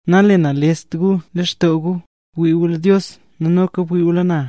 ’Nalenalest gu lextoo gu. Ngwii gu lo Dios noka bwii gu lo na.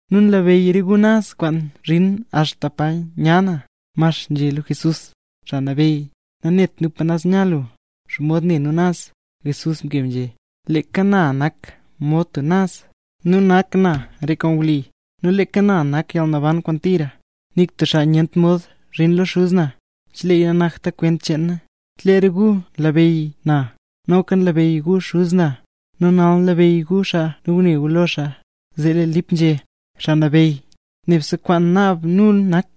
Nu nlabeyy re gu naz kwaan nzhin axta pa nya na. Max nzhé lo Jesús: —Xaa Nabeyy, nanet nu pa naz nya lu, ¿xomod ne nu naz? Jesús mkeb nzhé: —Leeka na nak mod tub naz, nu nak na re kwaan wli, nu leeka na nak yalnaban kwaan tira. Nik tub xaa nyent mod zhin lo Xuz na, cheleeya nanakta kwent cheen na. Chelee re gu nlabeyy na, noka nlabeyy gu Xuz na. Nu nal nlabeyy gu xaa nel ngune gu lo xaa. Zee lee Lip nzhé: —Xaa Nabeyy, nebse kwaan naab nu nak,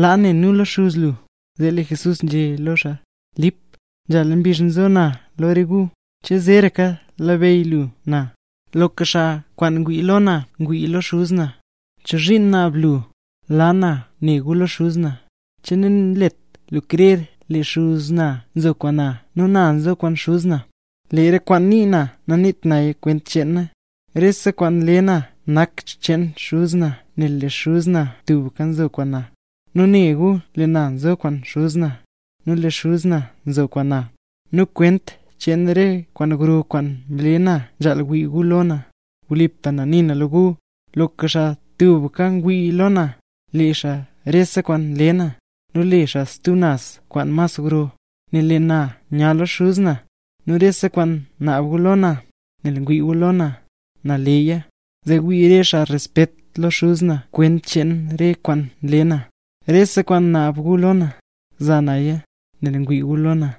laa ne nu lo Xuz lu. Zee lee Jesús nzhé lo xaa: —Lip, nzhala mbizh nzo na lo re gu, ¿che zeeraka labeyy lu na? Loka xaa kwaan ngwii lo na ngwii lo Xuz na; ¿chozhiin naab lu, laa na ne gu lo Xuz na? ¿Che nanlet lu krer lee Xuz na nzo kwaan na nu na nzo kwaan Xuz na? Lee re kwaan nii na naniit naya kwent cheen na. Rese kwaan nle na nak xcheen Xuz na nel lee Xuz na tubka nzo kwaan na. Nu ne gu lee na nzo kwaan Xuz na, nu lee Xuz na nzo kwaan na; nu kwent cheen re kwaan gro kwaan nle na, nzhaal wii gu lo na. Wlipa na nii na lo gu, loka xaa tubka ngwii lo na, le xaa rese kwaan nle na; nu le xaa stub naz kwaan mas gro, nel lee na nya lo Xuz na. Nu rese kwaan naab gu lo na, nel ngwii gu lo na, na leya; zee wii re xaa respet lo Xuz na kwent cheen re kwaan nle na. Rese kwaan naab gu lo na, za naya, nel ngwii gu lo na.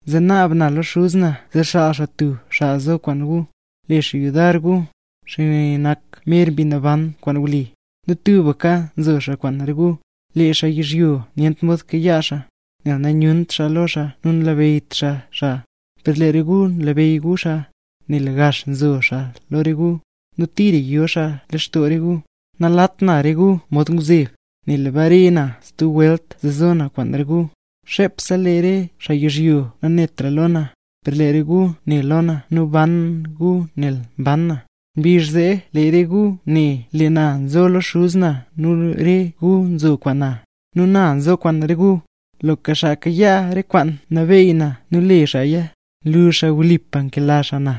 Zee naab na lo Xuz na zee xaal xaa stub xaa zo kwaan gu, le xaa yudar gu. Xaa ne nak mer Mbi Naban kwaan wli, nu tubka zo xaa kwaan re gu. Lee xaa yizhyo nyent mod kayaa xaa, nel nanyunt xaa lo xaa nu nanlabeyyt xaa xaa; per lee re gu nlabeyy gu xaa, nel gax nzo xaa lo re gu, nu tira yo xaa lextoo re gu. ’Nalat na re gu mod ngwzeb, nel bare na stub welt zee zo na kwaan re gu. Xepse lee re xaa yizhyo nanetra lo na; per lee re gu ne lo na nu mban gu nel mban na. Mbizh zee lee re gu ne, lee na nzo lo Xuz na nu re gu nzo kwaan na, nu na nzo kwaan re gu. Loka xaa kayaa re kwaan nabeey na nu le xaaya, nlu xaa wlipa nkela xaa na.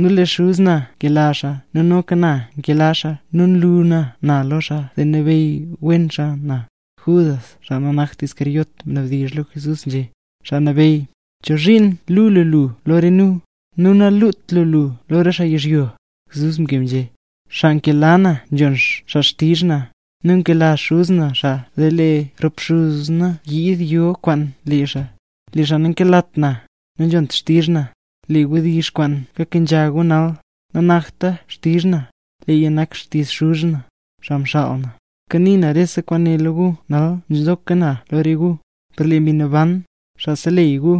Nu lee Xuz na nkela xaa nu noka na nkela xaa nu nlu na na lo xaa zee labeyy wen xaa na. Judas (xaa nanakt Iscariote) mnabdizh lo Jesús nzhé: —Xaa Nabeyy, ¿chozhiin luu lu lu lo re nu, nu nalut lu lu lo re xaa yizhyo? Jesús mkeb nzhé: —Xaa nkela na nzhon xaa xtizh na; nu nkela Xuz na xaa zee lee rop Xuz na yiid yo kwaan lee xaa. Lee xaa nankelat na, nanzhont xtizh na. Lee re wdizh kwaan kakenzha gu nal, nanakta xtizh na, Leeya nak xtizh Xuz na, xaa mxaal na. ’Kanii na rese kwaane lo gu nal nzoka na lo re gu; per lee Mbi Naban, Xaa Seleyy gu,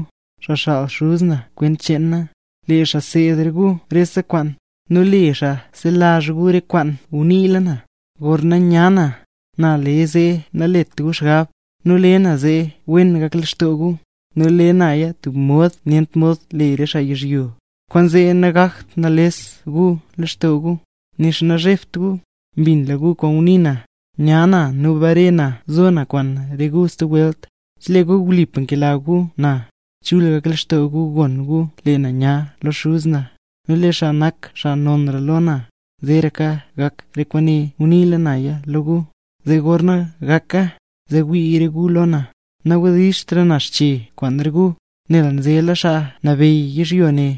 xaa xaal Xuz na kwent cheen na, lee xaa seed re gu rese kwaan, nu le xaa selazh gu rese kwaan nguniila na. ’Gorna nya na, na le zee nalet gu xgab, nu lee na le zee wen gak lextoo gu; nu le naya tub mod nyent mod le re xaa yizhyoya. Kwaanzee nagak nalest gu lextoo gu, nixa nazhebt gu. Mbinla gu ngunii na, nya na nu bare na zo na kwaan re gu stub welt. Chelee gu wlipa nkela gu na, chul gak lextoo gu gon gu lee na nya lo Xuz na, nel lee xaa nak xaa nonra lo na. Zeeraka gak re kwaane nguniila naya lo gu, zee gorna gaka, zee wii re gu lo na. ’Nawdizhtra na xche kwaan re gu, nel nzela xaa nabeyy yizhyo ne.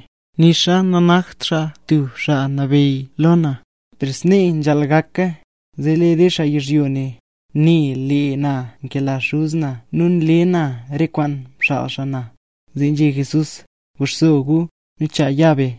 Nixa nanakt xaa tub xaa nabeyyra lo na, per snee nzhaal gaka, zee lee re xaa yizhyo ne, ne lee na nkela Xuz na nu nle na re kwaan mxaal xaa na. Zee nzhé Jesús: —Guxso gu, nu chaa nya be.